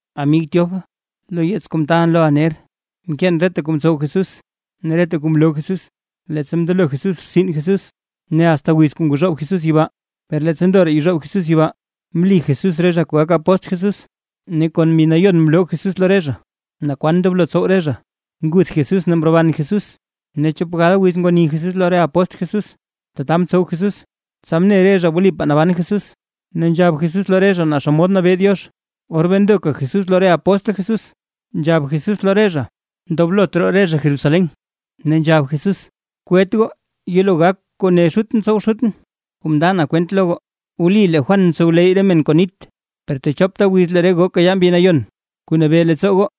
Amig Teófilo, lo yeets kuu mtaalʼn loʼa ner, mkeen reta kuu mtsow Jesús ne reta kuu mloo Jesús, leettsa mndelo Jesús rtsin Jesús, ne asta wiz kuu ngozhoob Jesús yibaa. Per leettsa ndoraa yezhoob Jesús yibaa, mli Jesús re zha kuu gak apóstl Jesús, ne kon Mbi Nayon mloo Jesús lo re zha naa kwan ndoblo tsow re zha. Nguth Jesús ne mroban Jesús, ne chop gal wiz ngwani Jesús lo re apóstl Jesús. Tata mtsow Jesús, tsa mne re zha wlipaa naban Jesús, ne nzhab Jesús lo re zha naa xomod nabee Diox. Or bee ndoka Jesús lo re apóstl Jesús, nzhab Jesús lo re zha ndoblot roo re zha Jerusalén. Ne nzhab Jesús: ―Kwet goo yelo gak kuu mne Xutʼn tsow Xutʼn kuu mnda na kwent lo goo. Wli lee Juan mtsowleyy re men kon nit, per techopta wiz lee re goo kayaa Mbi Nayon kuu nabee leettsoo goo.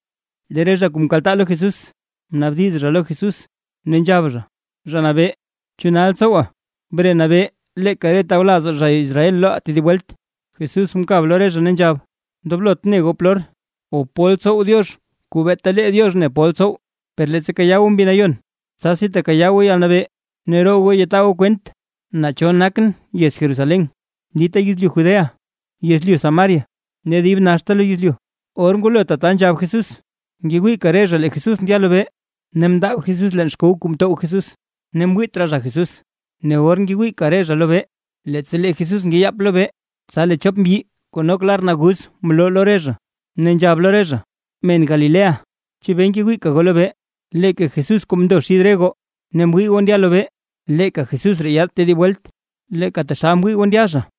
Lee re zha kuu mkaltaa lo Jesús, mnaabdiz lo Jesús ne nzhab: ―Zha Nabee, ¿chu nal tsowa bre nabee leeka re tawlazaa zha Israel loʼaa tedib welt? Jesús mkab lo re zha, ne nzhab: ―Ndoblot goo ne goo polor o pol tsow Diox kuu beeta lee Diox ne pol tsow, per leettsa kayaa goo Mbi Nayon, tsasi tekayaa goo yalnabee ne roo goo yataa goo kwent naa cho nakʼn yez Jerusalén, dita yezlyu Judea, yezlyu Samaria ne dib naxta lo yezlyu. Or ngwalo tata nzhab Jesús, ngewiika re zha lee Jesús ndya lobee, ne mndaab Jesús leen xkow kuu mtow Jesús, ne mwiit raa re zha Jesús. Ne or ngewiika re zha lobee, leettsa lee Jesús ngeyap lobee, tsa lee chop mbyi kuu nok lar naguz mloo lo re zha, ne nzhab lo re zha: ―Men, Galilea, ¿chebee ngewiika goo lobee? Leeka Jesús kuu mndo xid re goo ne mwii goo ndya lobee, leeka Jesús ree yaad tedib welt, leeka taxal mwii goo ndya zha.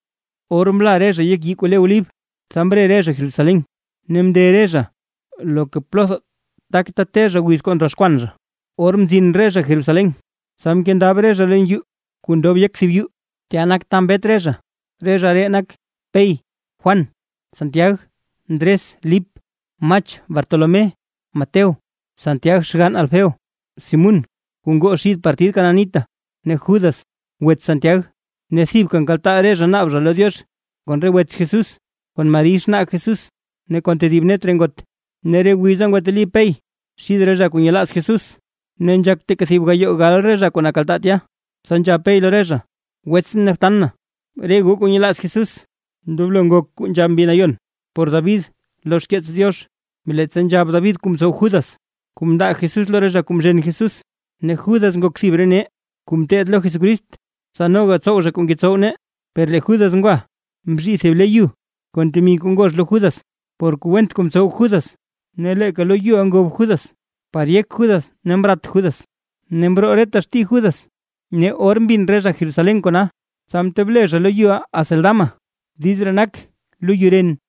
Or mla re zha yek yii kuu le Olib, tsa mre re zha Jerusalén, ne mnde re zha loka plotha kuu takta te zha wiz kuu ndroxkwan zha. Or mzin zha Jerusalén, tsa mkendab re zha leen yuu kuu ndob yek thib yuu, tya nak ta mbet re zha, re zha ree nak: Pey, Juan, Santiag, Ndres, Lip, Mach, Bartolomé, Mateo, Santiag xgann Alfeo, Simún kuu ngoo xid partid Cananita ne Judas (wets Santiag). Ne thibka nkaltaa re zha naab zha lo Diox kon re wets Jesús, kon Mari xnaa Jesús ne kon tedib net re ngot. Ne re wiza ngwateli Pey xid re zha kuu nyelaaz Jesús, ne nzhak teeka thib gayoo gal re zha kuu nkaltaa tya, tsa nzhab Pey lo re zha: ―Wets ne btan, re goo kuu nyelaaz Jesús, ndoblo ngok kuu nzhab Mbi Nayon por David lo xkeets Diox, leettsa nzhab David kuu mtsow Judas, kuu mndaa Jesús lo re zha kuu mzhen Jesús. Ne Judas ngok thib re nee kuu mteed lo Jesucrist, tsa noga tsow zha kuu ngetsow nee. Per lee Judas ngwa, mzhii thib le yu kon temi kuu ngox lo Judas, por kuu went kuu mtsow Judas, ne leeka loyuʼa ngob Judas par yek Judas ne mrat Judas, ne mroo reta xtii Judas. Ne or mbin re zha Jerusalén kona, tsa mtob le zha loyuʼa Acéldama (diiz ree nak: “Loyu ren”).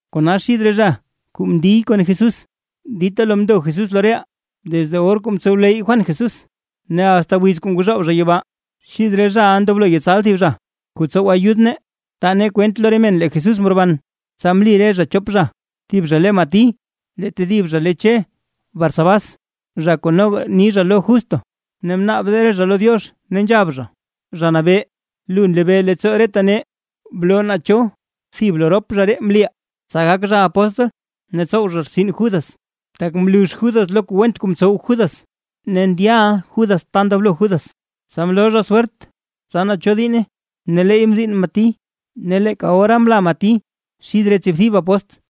’Kona xid re zha kuu mndiy kon Jesús, dita lo mndo Jesús lo reʼaa, desde or kuu mtsowleyy Juan Jesús, ne asta wiz kuu ngwazhoob zha yibaa. Xid re zhaʼa ndoblo yetsal thib zha kuu tsow ayud nee, taa nee kwent lo re men lee Jesús mroban. Tsa mli re zha chop zha: Thib zha le Mati lee tedib zha le Che Barsabás, zha kuu noga ni zha lo Justo. Ne mnaab re zha lo Diox, ne nzhab zha: ―Zha Nabee, lu nlebee leettsoo reta nee. Bloo naa cho thib lo rop zha ree mliʼa, tsa gak zha apóstl ne tsow zha rtsin Judas, tak mlux Judas lo kuu went kuu mtsow Judas, ne ndyaʼa Judas ta ndoblo Judas. Tsa mloo zha swert, tsa naa cho diinne, ne leey mdiinn Mati. Ne leeka ora mla Mati xid re tsiibthib apóstl.